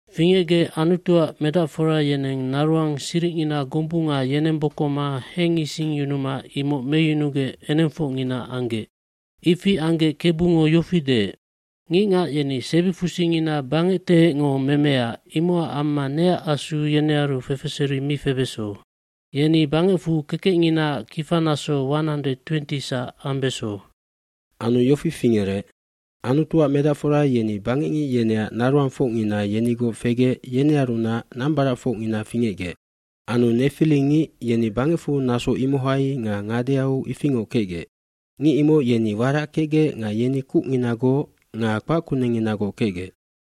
cFingecgec Anutuac medacforab yeneng naroang siricngina gombunga yenembokoma hengisingyunuma imoc meyunugec enengfocngina anggec. Ifi anggec Kebungo yofi deec, “Ngicngac yeni sebifusingina bangectehecngo memea imocac amma neac asu yenearu fefeseri mi febeso. Yeni bangecfu kekecnginaac kifanaso 120sac ambeso.” eAnu yofi fingerec Anutuac medacfora yeni bangecngic yeneac naroangfocngina yenigoc fegec yenearunac nambaracfocngina fingecgec. Anu nefilingicd yeni bangecfu naso imohai nga ngadeau ifingoc kecgec. Ngic imoc yeni warac kecgec nga yeni kucnginagoc nga kpac kunengnginagoc kecgec.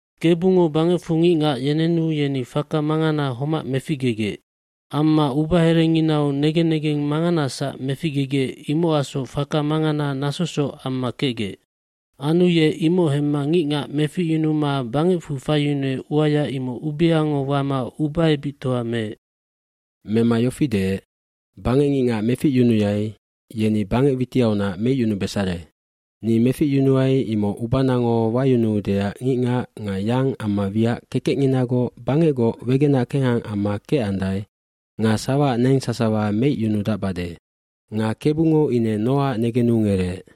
fKebungo bangecfu ngicngac yenenu yeni faka mangana homac meficgegec. Amma ubaherenginau negen negeng manganasac feu imocacsoc faka mangana nasosoc amma kecgec. Anu ye imoc hemma ngicngac meficyunuma bangecfu faiyunuec uaya imoc ubeango wama ubaebictoa meec. Mema yofi deec, “Bangecngicngac meficyunuai yeni bangec witiaunac meicyunubesare. Ni meficyunuai imoc ubanango wayunuduaeac ngicngac nga yang amma wiac kekecnginagoc bangecgoc wegenac kengha amma kecandae nga sawaac neng sasawa meicyunudacbade.” Nga Kebungo ine Noaac negenu ngereec.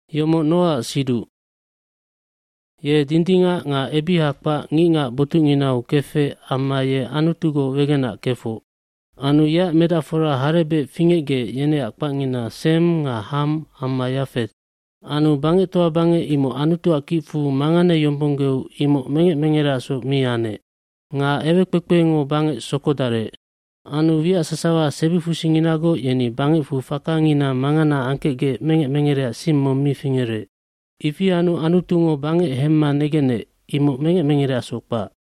gYomoc Noaac siduc. Ye dindingac nga kopocsiha kpac ngicngac botucnginau kefec amma ye Anutugoc wegenac kefoc. hAnu yeac medacfora harebec fingecgec yeneac kpacngina Sem nga Ham amma Yafet. Anu bangectoa bangec imoc Anutuac kicfu manganeyombonggeu imoc mengec mengereacsoc mi anec. Nga ewekpekpengo bangec sokodarec. Anu wiac sasawa sebifusinginagoc yeni bangecfu fakangina mangana angkecgec mengec mengereac sing mong mi fingerec. Ifi anu Anutungo bangec hemma negenec imoc mengec mengereasoc kpac.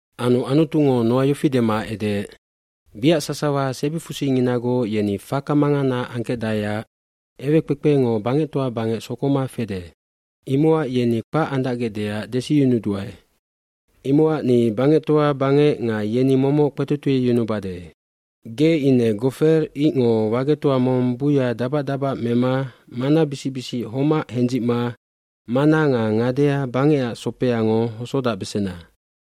Anu Anutungo Noa yofi dema edeec, “Wiac sasawa sebifusinginagoc yeni faka mangana angkecdaeac ewekpekpengo bangectoa bangec sokoma fede. Imocac yeni kpac andacgecdeac desiyunubesandua. Imocac ni bangectoa bangec nga yeni momoc kpetotieyunubade. Ge ine gofer icngoi wagetoaj mong buya dabac dabac mema manabisic bisic homac hendzicma mana nga ngadea bangecac sopeangok hosodacbesena.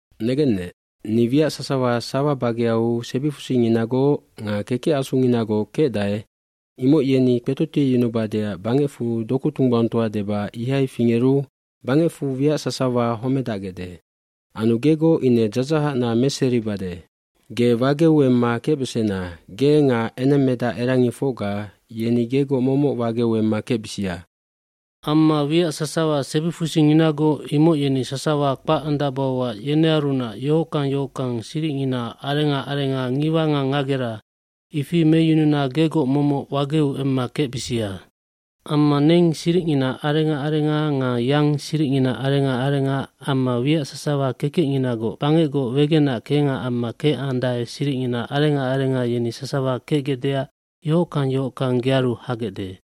Negennec, ni wiac sasawa sawa bageau sebifusinginagoc nga kekec asunginagoc kecdae imoc yeni kpetotieyunubadeac bangecfu doku tunggbaungtoa deba ihai fingeru bangecfu wiac sasawa homedacbesandae. lAnu gegoc ine dzadzahacna meseribade. Ge wageu emma kecbesena, ge nga enengmedacerangifocga yeni gegoc momoc wageu emma kecbisia. mAmma wiac sasawa sebifusinginagoc imoc yeni sasawa kpac andacbauac yenearunac yohockang yohockang siricngina arenga arenga ngiwa nga ngagera ifi meyununa gegoc momoc wageu emma kecbisia. Amma neng siricngina arenga arenga nga yang siricngina arenga arenga amma wiac sasawa kekecnginagoc bangecgoc wegenac kengha amma kecandae siricngina arenga arenga yeni sasawa kecgecdeac yohockang yohockang gearu habesandae.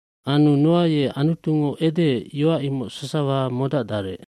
nAnu Noa ye Anutungo edeec yoac imoc sasawa modacdarec.